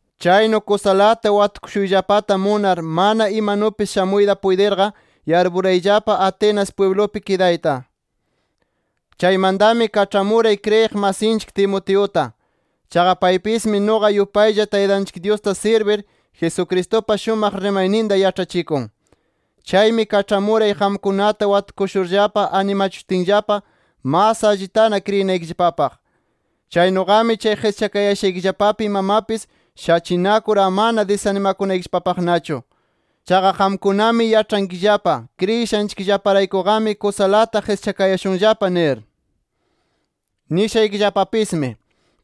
Chaynu kusalata watukushuyllapata munar, mana imanupis shamuyta puytirqa, yarpurayllapa Atenas pwiblupi kidayta. Chaymantami kaĉhamuray kriyiq masinchik Timoteuta. Chaqa paypismi nuqa yupaylla, Taytanchik Dyusta sirbir, Jesucristupa shumaq rimayninta yaĉhachikun. Chaymi kaĉhamuray qamkunata watukushurllapa animachishutinllapa, mas allitana kriyinaykillapapaq. Chaynuqami chay qischakayashaykillapapi imamapis shachinakur amana disanimakunaykillapapaqnachu. Chaqa qamkunami yaĉhankillapa kriyishanchikllaparaykuqami kusalata qischakayashunllapa nir. Nishaykillapapismi: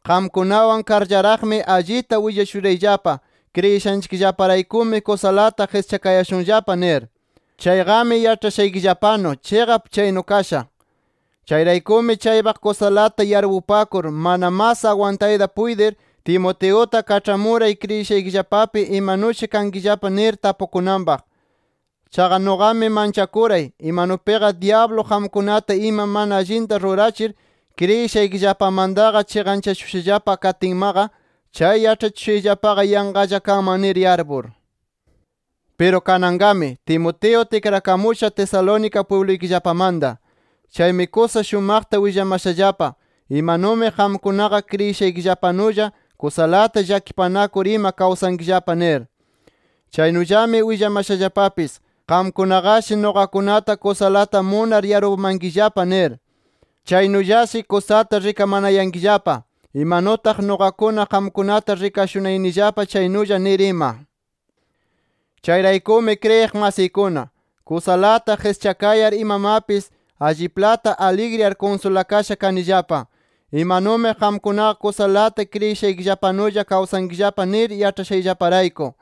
Qamkunawan karllaraqqami, allita willashurayllapa kriyishanchikllaparaykumi kusalata qischakayashunllapa nir. Chayqami yaĉhashaykillapanu, chiqap chaynu kasha. Chayraykumi chaypaq kusalata yarpupakur mana mas agwantayta puytir, Timoteuta kaĉhamuray kriyishaykillapapi imanushi kankillapa nir, tapukunanpaq. Chaqa nuqami manchakuray, imanupiqa dyablu qamkunata ima mana allinta rurachir, kriyishaykillapamantaqa chiqanchashushallapa katinmaqa, chay yaĉhachikushayllapaqa yanqalla kanman nir yarpur. Piru kananqami, Timoteo tikrakamusha Tesalónica pwibluykillapamanta. Chaymi kusa shumaqta willamashallapa, imanumi qamkunaqa kriyishaykillapanulla, kusalata llakipanakur ima kawsankillapa nir. Chaynullami willamashallapapis, qamkunaqashi nuqakunata kusalata munar yarpumankillapa nir. Chaynullashi kusata rikamanayankillapa, imanutaq nuqakuna, qamkunata rikashunayanillapa chaynulla nir ima. Chayraykumi kriyiq masiykuna, kusalata qischakayar imamapis alliplata aligriyar kunsulakasha kanillapa, imanumi qamkunaqa kusalata kriyishaykillapanulla kawsankillapa nir yaĉhashayllaparayku.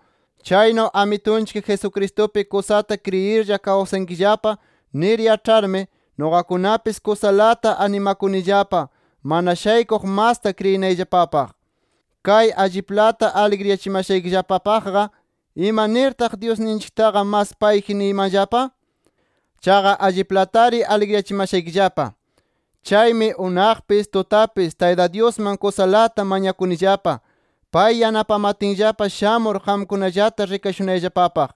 Chaynu Amitunchik Jesucristupi kusata kriyirlla kawsankillapa nir yaĉharmi, nuqakunapis kusalata animakunillapa mana shaykuq masta kriyinayllapapaq. Kay alliplata aligriyachimashaykillapapaqqa, ¿ima nirtaq Dyusninchiktaqa mas payji niymanllapa? Chaqa alliplatari aligriyachimashaykillapa. Chaymi unaqpis, tutapis Tayta Dyusman kusalata mañakunillapa, pay yanapamatinllapa shamur qamkunallata rikashunayllapapaq.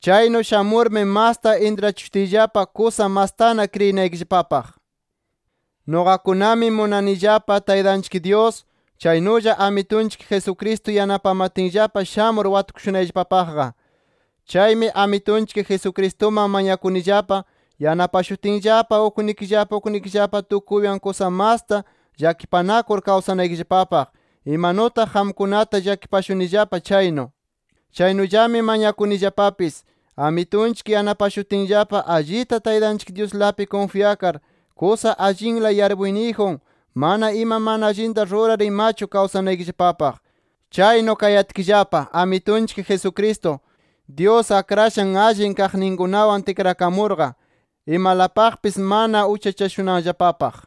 Chaynu shamurmi masta intrachishutiyllapa kusa mastana kriyinaykillapapaq. Nuqakunami munanillapa Taytanchik Dyus, chaynulla Amitunchik Jesucristo yanapamatinllapa shamur watukushunayllapapaqqa. Chaymi Amitunchik Jesucristuman mañakunillapa, yanapashutinllapa uknikillapa uknikillapa tukuywan kusa masta llakipanakur kawsanaykillapapaq, imanutaq qamkunata llakipashunillapa chaynu. Chaynullami mañakunillapapis, Amitunchik yanapashutinllapa allita Taytanchik Dyuslapi kunfyakar, kusa allinla yarpuyniyjun, mana ima mana allinta rurar imachu kawsanaykillapapaq. Chaynu kayatkillapa Amitunchik Jesucristo, Dyus akrashan allin kaqninkunawan tikrakamurqa, imalapaqpis mana uchachashunanllapapaq.